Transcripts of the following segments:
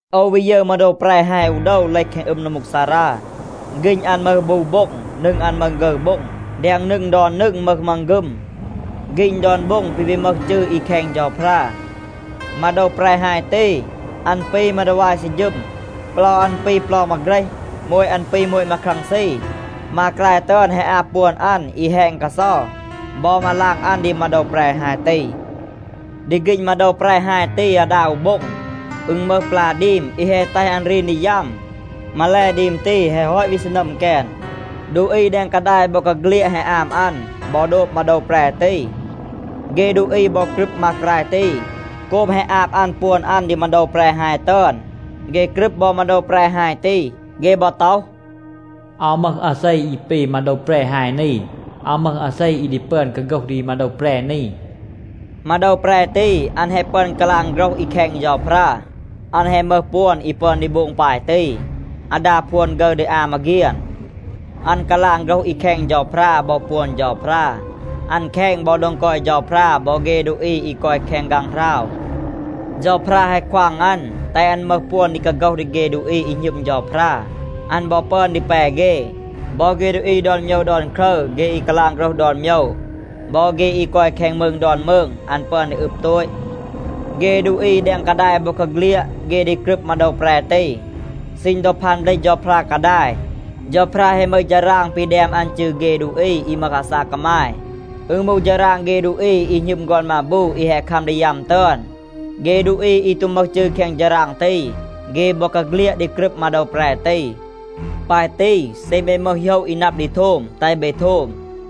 โอว วี ยึร มาโดว แปร ฮาย อู โดว เลห แคง อึม นัมมูกซารา. ฆีณ อัน มึห บู โบ็ง. นึง อัน มึห ฆึร โบ็ง. แดง นึง ดอน นึง มึห มังฆึม. ฆีณ ดอน โบ็ง ปี วี มึห จืร อี แคณ เฌาพรา. มาโดว แปร ฮาย ตี, อัน ปี มาดีวาย ซืร ฌึม. เปลา อัน ปี เปลา มาเฆรห. โมต อัน ปี โมต มาครังซี. มากราย ตึอน แฮะ อาบ ปวน อัน อี แฮณ กาเซา บอ มาลาง อัน ดี มาโดว แปร ฮาย ตี. ดี ฆีณ มาโดว แปร ฮาย ตี อาดา อู โบ็ง, อึณ มึห ปลา ดีม อี แฮะ แตห อัน รีน ดี ยัม. มาแล, ดีม ตี, แฮะ ฮอต วี ซีนัม แกน. ดูอี แดง กาดาย บอกาเฆลียด แฮะ อาม อัน บอ โดบ มาโดว แปร ตี. เฆ ดูอี บอ กรึบ มากราย ตี, โกบ แฮะ อาบ อัน ปวน อัน ดี มาโดว แปร ฮาย ตึอน. เฆ กรึบ บอ มาโดว แปร ฮาย ตี. เฆ บอ ต็อห, “อาว มึห อาเซ อี ปี มาโดว แปร ฮาย นี. อาว มึห อาเซ อี ดี ปึอน กาโฆห ดี มาโดว แปร นี.” มาโดว แปร ตี, อัน แฮะ ปึอน กาลาง โฆรห อี แคณ เฌาพรา. อัน แฮะ มึห ปวน อี ปึอน ดี โบง ปาย ตี, อาดา พวน ฆึร ดี อา มาเฆียน. อัน กาลาง โฆรห อี แคณ เฌาพรา บอ ปวน เฌาพรา. อัน แคณ บอ โดง กอย เฌาพรา บอ เฆ ดูอี อี กอย แคง ฆางหราว. เฌาพรา แฮะ ควาง อัน, แตห อัน มึห ปวน ดี กาโฆห ดี เฆ ดูอี อี หณึม เฌาพรา. อัน บอ ปึอน ดี แป เฆ. บอ เฆ ดูอี ดอน โมยว ดอน ครึร, เฆ อี กาลาง โฆรห ดอน โมยว, บอ เฆ อี กอย แคง มืง ดอน มืง, อัน ปึอน ดี อึบ โตต. เฆ ดูอี แดง กาดาย บอกาเฆลียด, เฆ ดี กรึบ มาโดว แปร ตี. ซีณ ดอ พาน เบลห เฌาพรา กาดาย, เฌาพรา แฮะ มึห ฌาราง ปี แดม อัน จืร เฆ ดูอี อี มึห อาซาก กามาย, อึณ มูห ฌาราง เฆ ดูอี อี หณึม ฆอน มาบู อี แฮะ คัม ดี ยัม ตึอน. เฆ ดูอี อี ตู มึห จืร แคง ฌาราง ตี, เฆ บอกาเฆลียด ดี กรึบ มาโดว แปร ตี. ปาย ตี, เซ เบ มึห โหยะ อี นับ ดี โทม, แตห เบ โทม.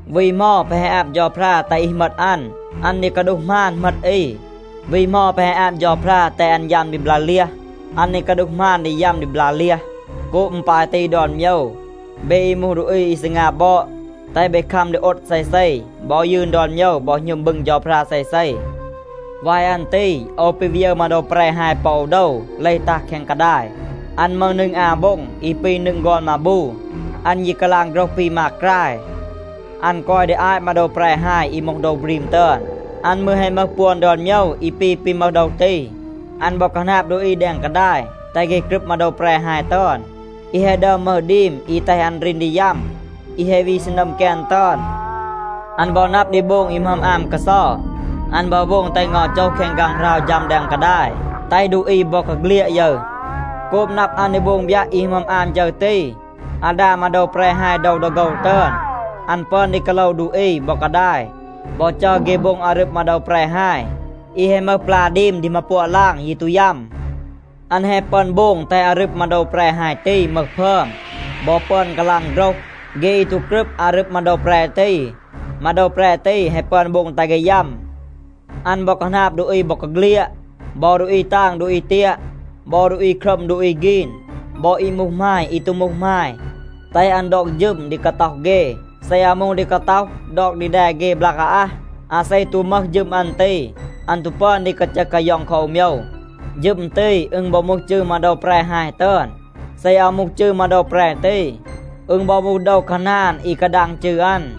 วี เหมา แปะ แฮะ อาบ เฌาพรา แตห อี เหมต อัน, อัน ดี กาดูห หมาน เหมต อี. วี เหมา แปะ แฮะ อาบ เฌาพรา แตห อัน ยัม ดี บลา เลียห, อัน ดี กาดูห หมาน ดี ยัม ดี บลา เลียห. โกบ อึณ ปาย ตี ดอน โมยว, เบ อี มูห ดูอี อี ซีงา บอด, แตห เบ คัม ดี โอด เซเซ บอ ยืน ดอน โมยว บอ หณึม บึง เฌาพรา เซเซ. วาย อัน ตี โอว ปี วี ยึร มาโดว แปร ฮาย ปอ อู โดว เลห ตัห แคง กาดาย. อัน มึห นึง อา โบ็ง อี ปี นึง ฆอน มาบู. อัน ยี กาลาง โฆรห ปี มากราย. อัน กอย ดี อาต มาโดว แปร ฮาย อี มูห โดว บรีม ตึอน. อัน มืร แฮะ มึห ปวน ดอน โมยว อี ปี ปี มึห โดว ตี. อัน บอ คาหนาบ ดูอี แดง กาดาย, แตห เฆ กรึบ มาโดว แปร ฮาย ตึอน, อี แฮะ ดึอม มึห ดีม อี แฮะ แตห อัน รีน ดี ยัม, อี แฮะ วี ซีนัม แกน ตึอน. อัน บอ นับ ดี โบง อี หมึอม อาม กาเซา. อัน บอ โบง แตห เงา โจห แคง ฆางหราว ฌัม แดง กาดาย, แตห ดูอี บอกาเฆลียด ยึร. โกบ นับ อัน ดี โบง บยัะ อี หมึอม อาม ฌึร ตี อาดา มาโดว แปร ฮาย โดว ดอ โฆว ตึอน, อัน ปึอน ดี กาโลว ดูอี บอ กาดาย บอ จัร เฆ โบง อารึบ มาโดว แปร ฮาย อี แฮะ มึห ปลา ดีม ดี มาปัวะ ลาง ยี ตู ยัม. อัน แฮะ ปึอน โบง แตห อารึบ มาโดว แปร ฮาย ตี มึห พึอม บอ ปึอน กาลาง โฆรห. เฆ อี ตู กรึบ อารึบ มาโดว แปร ตี, มาโดว แปร ตี แฮะ ปึอน โบง แตห เฆ ยัม. อัน บอ คาหนาบ ดูอี บอกาเฆลียด บอ ดูอี ตาง ดูอี เตียะ, บอ ดูอี ครัม ดูอี ฆีน, บอ อี มูห หมาย อี ตู มูห หมาย, แตห อัน ดอก ฌึม ดี กาต็อห เฆ. เซ อาว มูห ดี กาต็อห, ดอก ดี แด เฆ บลาก อาอัห. อาเซ ตู มึห ฌึม อัน ตี, อัน ตู ปึอน ดี กาจึห กาย็อง คอ อู โมยว. ฌึม ตี, อึณ บอ มูห จืร มาโดว แปร ฮาย ตึอน. เซ อาว มูห จืร มาโดว แปร ตี, อึณ บอ มูห โดว คาหนาน อี กาดาง จืร อัน.